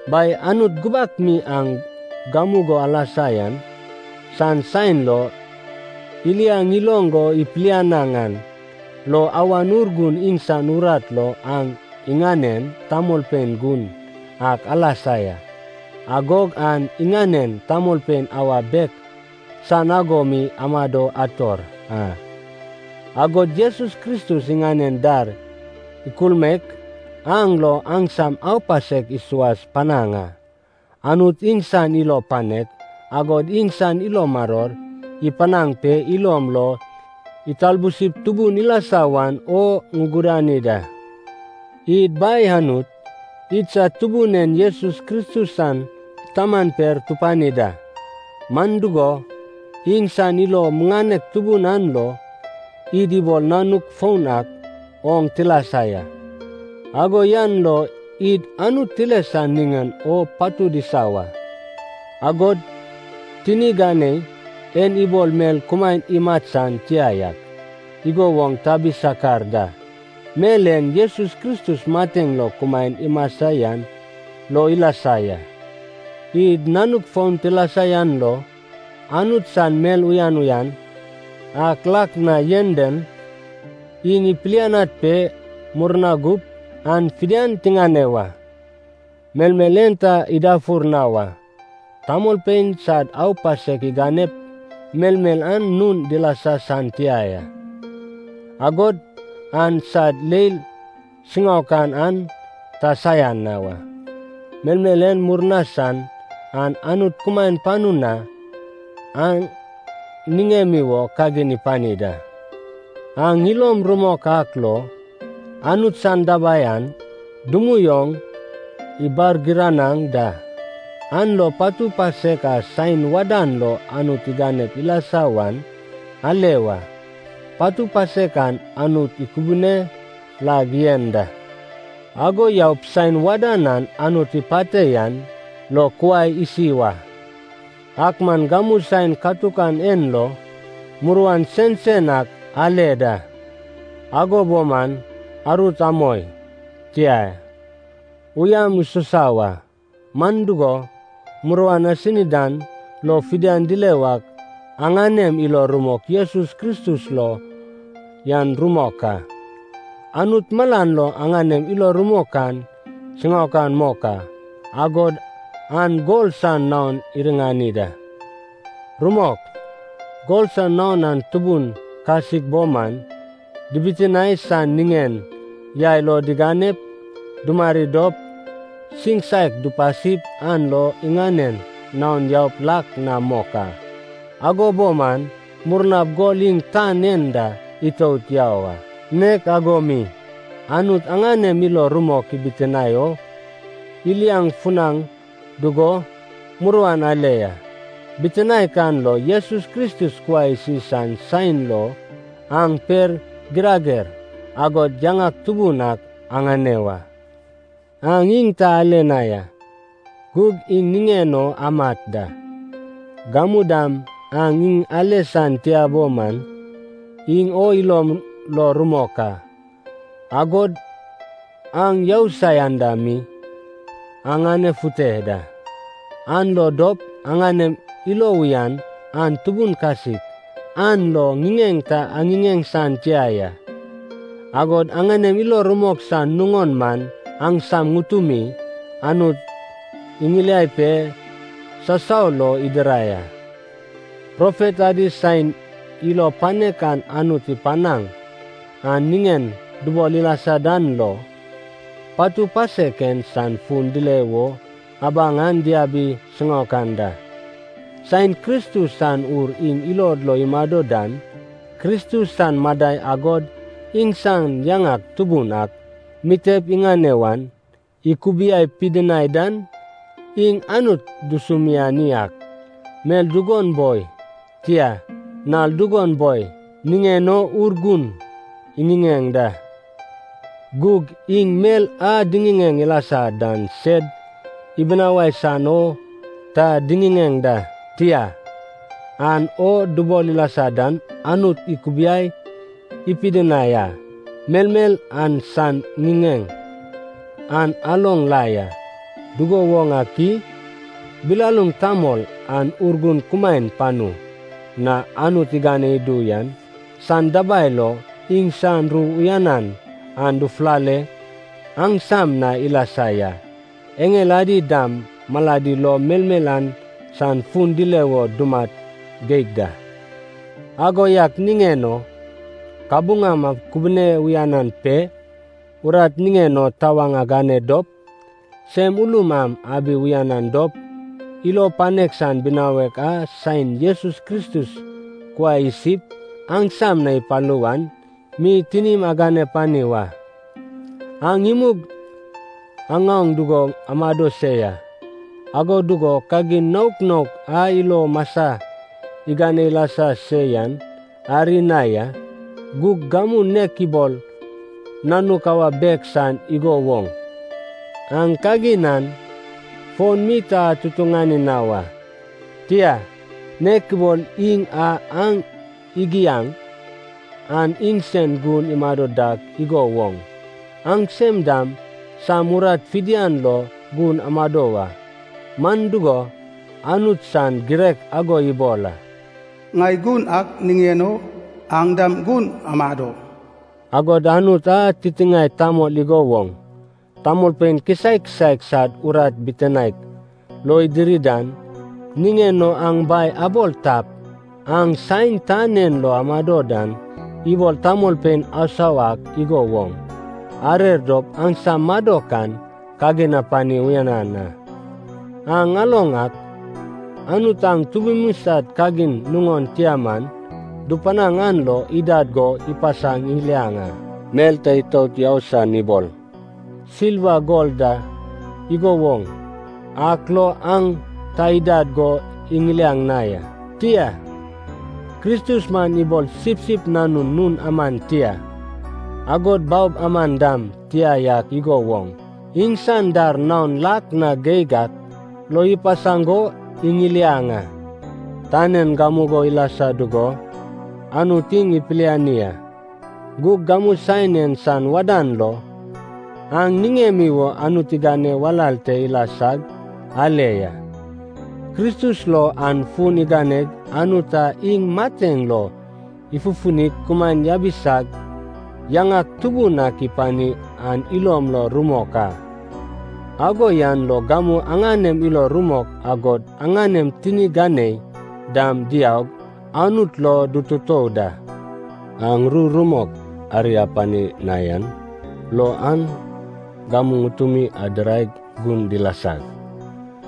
Bai Anut gubak mi aŋ gamugo alasa yan san saen lo iliaŋ iloŋ go ipilianaŋ an lo Awan Urgun iŋsan urat lo aŋ iŋanen tamolpein gun ak alasa ya. Agog aŋ iŋanen tamolpein awa bek san ago mi amado ator a, agod Jesus Kristus iŋanen dar ikulmaek an lo aŋsam aupasek isuas panaŋ a. Anut iŋsan ilo panek, agod iŋsan ilo maror ipanaŋ pe ilom lo italbusip tubun ilasa wan o ŋugudani da. Id Bai Anut, idsad Tubun en Jesus Kristus san Taman per tupani da. Man dugo, iŋsan ilo muŋanek tubun an lo, id ibol nanuk foun ak oŋ tilasa ya. Ago yan lo id Anut tile san niŋen o patud isa wa, agod tini ganei en ibol mel kumaen imat san tia yak igo woŋ tabi sakar da. Mel en Jesus Kristus mateŋ lo kumaen imasa yan lo ilasa ya. Id nanuk foun tilasa yan lo Anut san mel uyan uyan ak lak na yen dan, iŋ ipilianad pe murna gup an fidian tiŋane wa. Melmel en ta idafur na wa, tamolpein sad aupasek iganep melmel an nun dilasa san tia ya, agod an sad leil siŋaokan an ta saian na wa. Melmel en murna san an Anut kumaen panu na aŋ niŋemi wo kagin ipani da. Aŋ ilom rumok ak lo, Anut san dabai an dumui oŋ ibargiranaŋ da, an lo patu pasek a saen wadan lo Anut iganep ilasa wan ale wa. Patu pasek an Anut ikubune lag yen da, ago yaup saen wadan a Anut ipate yan lo kuai isi wa. Ak man gamu saen katukan en lo muruan sensen ak ale da, ago bo man arut amoi. Tia, uyam isusa wa, man dugo, muruan asini dan lo fidian dile wak aŋanem ilo rumok Jesus Kristus lo yan rumok a. Anut malan lo aŋanem ilo rumok an siŋaokan mok a, agod an gol san naon iriŋani da. Rumok, gol san naon an tubun kasik bo man, dibitinae san niŋen yai lo diganep dumari dop, siŋsak dupasip an lo iŋanen naon yaup lak na mok a. Ago bo man, murnap gol iŋ tan en da itout yau a. Nek ago mi, Anut aŋanem ilo rumok ibitinae o iliaŋ funaŋ dugo muruan ale ya, bitinaek an lo Jesus Kristus kuai isi san saen lo aŋ per, girager, agod yaŋak tubun ak aŋane wa. Aŋ iŋ ta ale na ya, gug iŋ niŋen o amat da. Gamu dam aŋ iŋ ale san tia bo man, iŋ o ilom lo rumok a. Agod aŋ yousai anda mi aŋanefute da, an lo dop aŋanem ilo uyan an tubun kasik an lo ŋiŋeŋ ta aŋiŋeŋ san tia ya. Agod aŋanem ilo rumok san nuŋon man aŋsam ŋutumi Anut iŋiliai pe sasau lo idirai a. Profet adi saen ilo panek a Anut ipanaŋ an niŋen dubol ilasa dan lo, patu pasek en san fun dile wo abaŋ an diabi siŋaokan da. Saen Kristus san Ur iŋ ilod lo imado dan Kristus san madai agod iŋsan yaŋak tubun ak mitep iŋane wan ikubiai pidinai dan, iŋ Anut dusumiani ak, mel dugon boi, tia, nal dugon boi, niŋen o Urgun iŋiŋeŋ da. Gug iŋ mel a diŋiŋeŋ ilasa dan sed ibinawai san o ta diŋiŋeŋ da, tia, aŋ o dubol ilasa dan Anut ikubiai pidinai a. Melmel an san ŋiŋeŋ an aloŋ la ya. Dugo woŋ ak i? Bilaluŋ tamol an Urgun kumaen panu na Anut igane idu yan san dabai lo iŋsan ru uyanan an dufulale aŋsam na ilasa ya. Eŋel adi dam maladi lo melmel an san fun dile wo dumat geig da. Ago yak niŋen o kabuŋam akubune uyanan pe urat niŋen o tawaŋ agane dop, sem ulum am abi uyanan dop, ilo panek san binawek a saen Jesus Kristus kuai isip aŋsam na ipalu wan mi tinim agane pani wa. Aŋ imug aŋaoŋ dugo amado se ya, ago dugo kagin naok naok a ilo masa igane ilasa se yan ari na ya, gug gamu nek ibol nanuk awa bek san igo woŋ, aŋ kagin an fon mi ta atutuŋani na wa. Tia, nek ibol Iŋ a aŋ igiaŋ an iŋsen gun imado dak igo woŋ, aŋsem dam sam urat fidian lo gun amado wa. Man dugo, Anut san girek ago ibol a, “Ŋai gun ak niŋen o, aŋ dam gun amado.” Agod Anut a titiŋae tamol igo woŋ tamolpein kisaek kisaek sad urat bitinaek lo idiri dan niŋen o aŋ Bai abol tap, aŋ saen tan en lo amado dan, ibol tamolpein asau ak igo woŋ arer dop aŋsam madok an kagin apani uyanan a. Aŋ aloŋ ak, Anut aŋ tubumi sad kagin nuŋon tia man dupanaŋ an lo idad go ipasaŋ iŋiliaŋ a. Mel ta itout yau san ibol silva gol da igo woŋ ak lo aŋ ta idad go iŋiliaŋ na ya. Tia, Kristus man ibol sipsip nanun nun aman tia, agod baob aman dam tia yak igo woŋ, iŋsan dar naon lak na geig ak lo ipasaŋ go iŋiliaŋ a. Tan en gamugo ilasa dugo Anut Iŋ ipiliani a, gug gamu saen en san wadan lo aŋ niŋemi wo Anut igane walal te ilasag ale ya. Kristus lo aŋ fun aganeg Anut a iŋ mateŋ lo ifufunig kumaen yabisag yaŋak tubun ak ipani an ilom lo rumok a, ago yan lo gamu aŋanem ilo rumok agod aŋanem tini ganei dam diaug Anut lo dututou da. Aŋ ru rumok ari apani na yan lo aŋ gamu ŋutumi adiraig gun dilasag,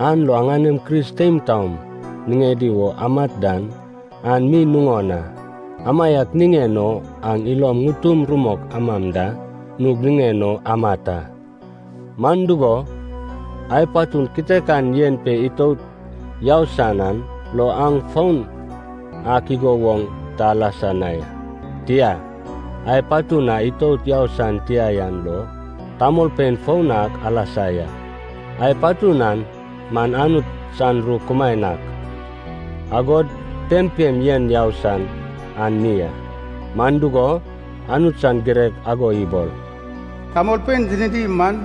an lo aŋanem Kris teim taom niŋedi wo amat dan, an mi nuŋon a. Amaiak niŋen o aŋ ilom ŋutum rumok amam da nug niŋen o amat a. Man dugo, ai patun kitekan yen pe itout yau san an lo aŋ foun ak igo woŋ ta alasa na ya. Tia, ai patun a itout yau san tia yan lo tamolpein foun ak alasa ya. Ai patun an man Anut san ru kumaen ak, agod pempem yen yau san an mi a. Man dugo, Anut san girek ago ibol, “Tamolpein tinidi man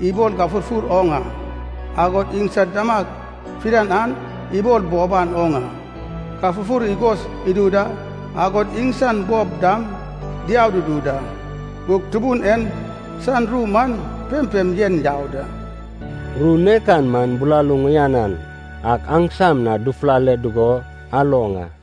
ibol gafurfur oŋ a, agod iŋsad damag fidian an ibol boban oŋ a. Gafurfur igos idu da, agod iŋsan bob dam diau dudu da. Gug Tubun en san ru man pempem yen yau da.” Ru nek an man bilaluŋ uyanan ak aŋsam na dufulale dugo aloŋ a.